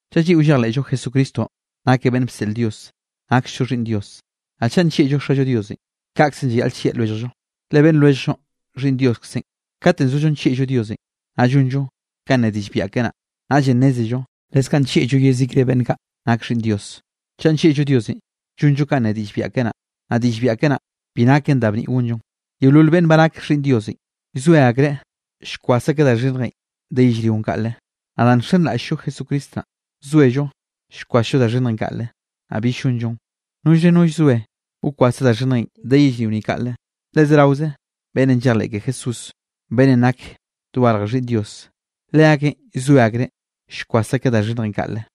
Chaꞌ lliꞌo llejleꞌllo Jesucristonꞌ nakeꞌ beꞌnne bseꞌl Dios, naksllo xhiꞌnn Dios. Naꞌ chaꞌ nllieꞌllo Xallo Diosenꞌ, kaꞌkzenꞌ llayaꞌl llieꞌ lwelljllo, le beꞌnn lwelljllonꞌ xhiꞌnn Dioskzenꞌ. Kate zollo nllieꞌllo Diosenꞌ, naꞌ llonllo kanꞌ ne diꞌll biaꞌa keꞌe naꞌ, naꞌllenꞌ nnézello leskaꞌ nllieꞌllo yezikre beꞌnn kaꞌ nak xhiꞌnn Dios. Chaꞌ nllieꞌllo Diosenꞌ, llonllo kanꞌ ne diꞌll biaꞌa keꞌe naꞌ. Naꞌ diꞌll biaꞌa keꞌe naꞌ, bi naken da bniꞌ gonllon. Yeolol beꞌnn ba nak xhiꞌnn Diosenꞌ, zoe akreꞌ llkwas akeꞌ da xhinnjenꞌ de yellrionꞌ kaꞌle. Naꞌ danꞌ nxenraꞌll-llo Jesucristo naꞌn, zoello llkwasllo da xhinnjenꞌ kaꞌle, naꞌ bill llonllon. Nollre no llzoe wkwase da xhinnjenꞌ de yellrio ni kaꞌle, le zeraoze beꞌnnenꞌ llejleꞌ ke Jesús beꞌnnenꞌ nakeꞌ dogarj Xhiꞌnn Dios, leakeꞌn llzoe akreꞌ llkwas akeꞌ da xhinnjenꞌ kaꞌle.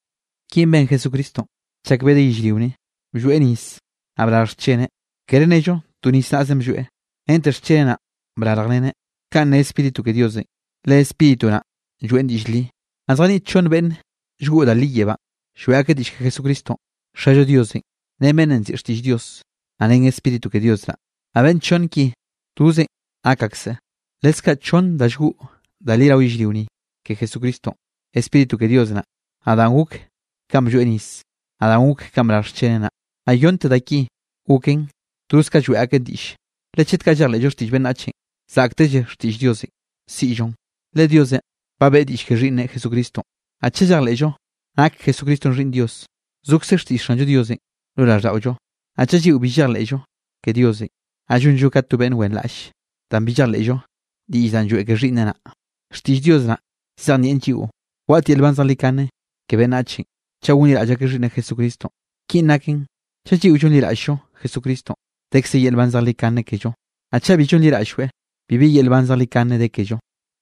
Kinꞌ ben Jesucristonꞌ chak bedeꞌ yellrio ni, blloeꞌ nis naꞌ brarj xcheneꞌ. Kere nello to nis naꞌzenꞌ blloeꞌ, rente xcheneꞌ naꞌn brarjreneꞌ. Kaꞌn ne Spíritu ke Diosenꞌ, le Spíritu naꞌ lloeꞌn diꞌll li. Naꞌ zjaniꞌt chonn beꞌnne llgoꞌ da li yebánꞌ, lloeꞌ akeꞌ diꞌll ke Jesucristonꞌ: Xallo Diosenꞌ, ren beꞌnnenꞌ nziꞌi Xtiꞌll Dios, naꞌ ren Spíritu ke Dios naꞌ. Naꞌ beꞌnn chonn ki, tozenꞌ nak akseꞌ. Leskaꞌ chonn da llgoꞌ da li rao yellrio ni ke Jesucristonꞌ: Spíritu ke Dios naꞌ, naꞌ danꞌ gok kanꞌ blloeꞌ nis, naꞌ danꞌ gok kanꞌ brarj xcheneꞌ naꞌ. Naꞌ yonnte da ki goken toz ka lloeꞌ akeꞌn diꞌlle. Le chet kaꞌ llejleꞌllo xtiꞌll beꞌnnachenꞌ, zaꞌktelle xtiꞌll Diosenꞌ siꞌllon, le Diosenꞌ ba beꞌe diꞌll ke Xhiꞌnneꞌ Jesucristonꞌ. Naꞌ chaꞌ llejleꞌllo nak Jesucristonꞌ Xhiꞌnn Dios, zokze xtiꞌll Xanllo Diosenꞌ lo raꞌlldaꞌollo. Naꞌ chaꞌ lliꞌo bi llejleꞌllo ke Diosenꞌ, naꞌ llonlloeꞌ ka to beꞌnn wenraꞌlle danꞌ bi llejleꞌllo diꞌll danꞌ lloeꞌ ke Xhiꞌnneꞌ naꞌ. Xtiꞌll Dios naꞌn llzejnieꞌ lliꞌo waꞌt yel nban zejlikane ke beꞌnnachenꞌ chaꞌ gonliraꞌll akeꞌ Xhiꞌnneꞌ Jesucristonꞌ. Kinꞌ naken chaꞌ lliꞌo llonliraꞌll-llo Jesucristonꞌ, dekze yel nban zejlikane kello. Naꞌ chaꞌ bi llonliraꞌll-lloeꞌ, bibi yel nban zejlikane de kello.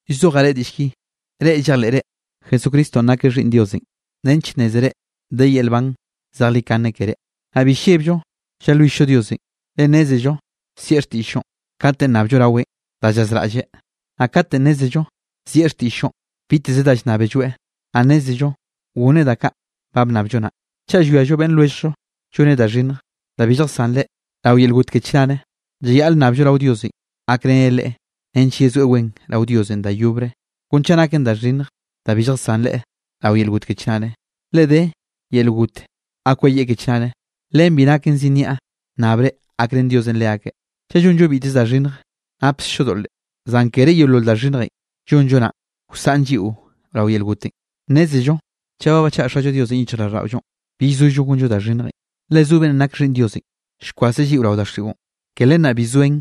Llzojaꞌ reꞌ diꞌll ki, reꞌ llejleꞌre Jesucristonꞌ nakeꞌ Xhiꞌnn Diosenꞌ, nench nnézere de yel nban zejlikane keré. Naꞌ bi llebllo llalwill-llo Diosenꞌ, le nnézello zieꞌ xtiꞌll-llonꞌ kate llnnabllo raweꞌn da llazraꞌlleꞌ. Naꞌ kate nnézello zieꞌ xtiꞌll-llonꞌ biteze da llnnábelloeꞌ, naꞌ nnézello gonneꞌ da kaꞌ ba bnnabllo naꞌ. Chaꞌ llwiallo beꞌnn lwelljllo lloneꞌ da xhinnj da bi lljasán leꞌe rao yel got ke chnare, llayaꞌle nnabllo rao Diosenꞌ gakreneꞌ leꞌe nench yezoeꞌ wen rao Diosenꞌ da yobre, kon chaꞌ naken da xhinnj da bi lljasán leꞌe rao yel got ke chnare. Le de yel got ga kweyieꞌ ke chnare. Len bi naken zi nniaꞌ nnabre gakrén Diosenꞌ leakeꞌ. Chaꞌ llonllo biteze da xhinnj napkzllo doꞌle, zan kere yeolol da xhinnjenꞌ llonllo naꞌn wsaꞌn lliꞌo rao yel gotenꞌ. Nnézello chaꞌ ba bachaꞌa Xallo Diosenꞌ yichjraꞌlldaꞌollonꞌ, bill sollo gonllo da xhinnjenꞌ, le zo beꞌnnenꞌ nake Xhiꞌnn Diosenꞌ, llkwaseꞌ lliꞌo rao daxiꞌon, ke len naꞌ bi zoen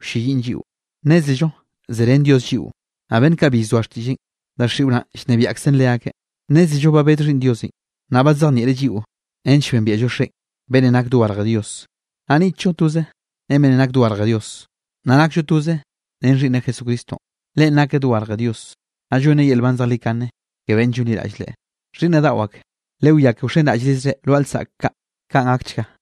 wlleyiꞌn lliꞌon. Nnézello zerén Dios lliꞌo, naꞌ beꞌnn kaꞌ bi llzoa xtiꞌlleꞌn, daxiꞌon llnebiaꞌkzen leakeꞌ. Nnézello ba bed Xhiꞌnn Diosenꞌ, naꞌ badzejnieꞌreꞌ lliꞌo nench bembiaꞌllo Xeꞌen, beꞌnnenꞌ nake dogarje Dios. Naꞌ niꞌtllo toze ren beꞌnnenꞌ nake dogarje Dios, naꞌ nakllo toze ren Xhiꞌnneꞌ Jesucristonꞌ. Leꞌen nakeꞌ dogarje Dios, naꞌ llonneꞌ yel nban zejlikane ke beꞌnne llonliraꞌll Leꞌe. Xhiꞌnnaꞌ daꞌo ak, lewiá ke wxenraꞌllrizre lwaꞌa lsaꞌk kaꞌ. Kaꞌn gakchga.